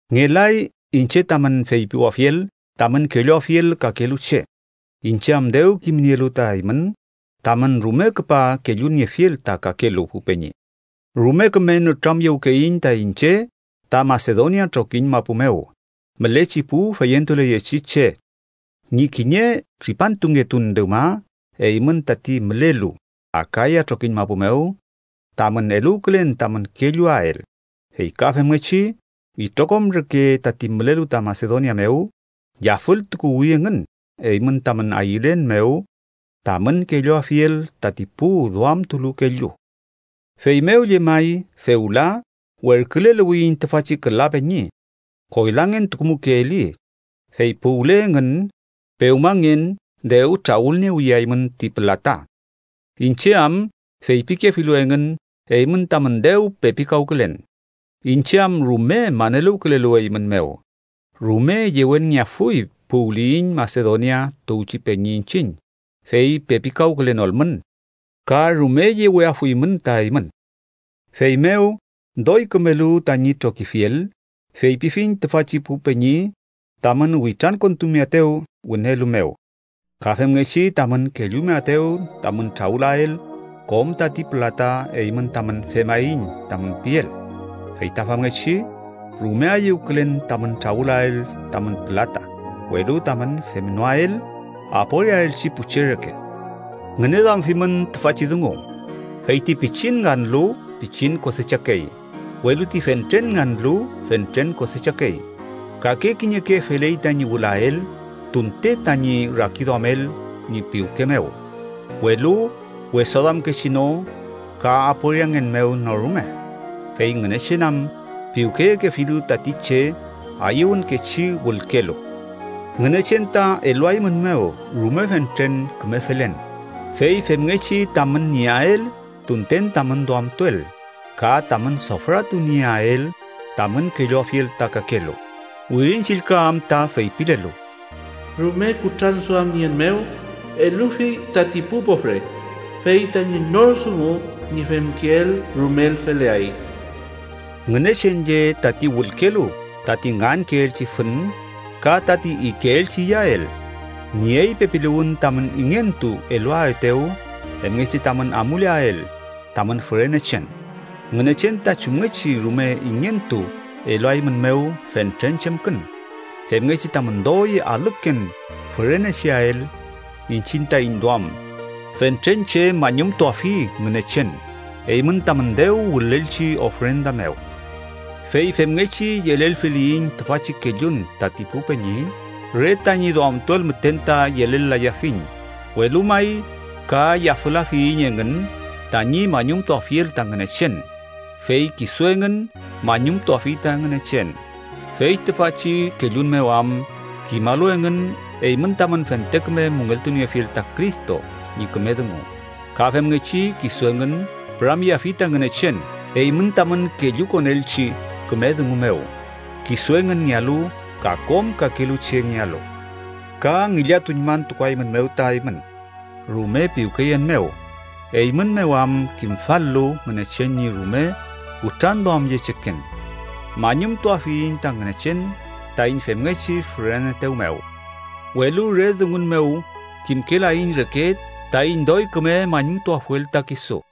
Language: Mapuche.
Ngelay iñche tamün feypiwafiel tamün kelluafiel kakelu che, iñche am dew kimnielu ta eymün tamün rume küpa kelluniefiel ta kakelu pu peñi. Rume küme nütramyewkeyiñ ta iñche ta Masedonia trokiñ mapu mew mülechi pu feyentuleyechi che, ñi kiñe tripantungetun dewma eymün tati mülelu Akaya trokiñ mapu mew tamün eluwkülen tamün kelluael. Fey ka femngechi itrokom reke tati mülelu ta Masedonia mew yafültukuwi engün, eymün tamün ayülen mew tamün kelluafiel tati pu duamtulu kellu. Feymew llemay fewla, werküleluwiyiñ tüfachi küla peñi. ¡Koylangentukumukeeli! Fey puwle engün, pewmangen dew trawülniewiyeaymün ti pülata, iñche am feypikefilu engün eymün tamün dew pepikawkülen. Iñche am rume maneluwkülelu eymün mew, rume yewenngeafuy puwliyiñ Masedonia tuwchi peñi iñchiñ, fey pepikawkülenolmün. Ka rume yeweafuymün ta eymün. Feymew doy kümelu tañi trokifiel, feypifiñ tüfachi pu peñi tamün witrankontumeaetew wünelu mew, ka femngechi tamün kellumeaetew tamün trawülael kom tati pülata eymün tamün “femaiñ” tamün piel. Fey ta famngechi, rume ayüwkülen tamün trawülael tamün pülata, welu tamün femnoael aporiaelchi pu che reke. Ngüneduamfimün tüfachi dungu: Fey ti pichin nganlu, pichin kosechakey. Welu ti fentren nganlu, fentren kosechakey. Kake kiñeke feley tañi wülael tunte tañi rakiduamel ñi piwke mew, welu wesaduamkechi no ka aporiangen mew no rume. Fey Ngünechen am piwkeyekefilu tati che ayüwünkechi wülkelu. Ngünechen ta eluaeymünmew rume fentren küme felen, fey femngechi tamün nieael tunten tamün duamtuel, ka tamün sofratu nieael tamün kelluafiel ta kakelu. Wirin Chillka am ta feypilelu: “Rume kutranduamnien mew elufi tati pu pofre, fey tañi nor dungu ñi femkeel rumel feleay.” Ngünechen lle tati wülkelu tati ngankeelchi fün ka tati ikeelchi iyael, niey pepiluwün tamün ingentu eluaetew femngechi tamün amuleael tamün fürenechen. Ngünechen ta chumngechi rume ingentu eluaeymünmew fentren chemkün, femngechi tamün doy alüken fürenecheael. Iñchiñ taiñ duam fentren che mañumtuafi Ngünechen, eymün tamün dew wülelchi ofrenda mew. Fey femngechi yelelfiliyiñ tüfachi kellun tati pu peñi, re tañi duamtuel müten ta yelel-layafiñ, welu may ka yafülafiyiñ engün tañi mañumtuafiel ta Ngünechen. Fey kisu engün mañumtuafi ta Ngünechen, fey tüfachi kellun mew am kimalu engün eymün tamün fente küme müngeltuniefiel ta Cristo ñi küme dungu. Ka femngechi kisu engün püramyeafi ta Ngünechen eymün tamün kellukonelchi küme dungu mew kisu engünngealu ka kom kakelu chengealu. Ka ngillatuñmantukuaeymünmew ta eymün rume piwkeyen mew, eymün mew am kimfal-lu Ngünechen ñi rume kutranduamyecheken. ¡Mañumtuafiyiñ ta Ngünechen taiñ femngechi füreneetew mew! ¡Welu re dungun mew kimkelaiñ reke taiñ doy küme mañumtuafuel ta kisu!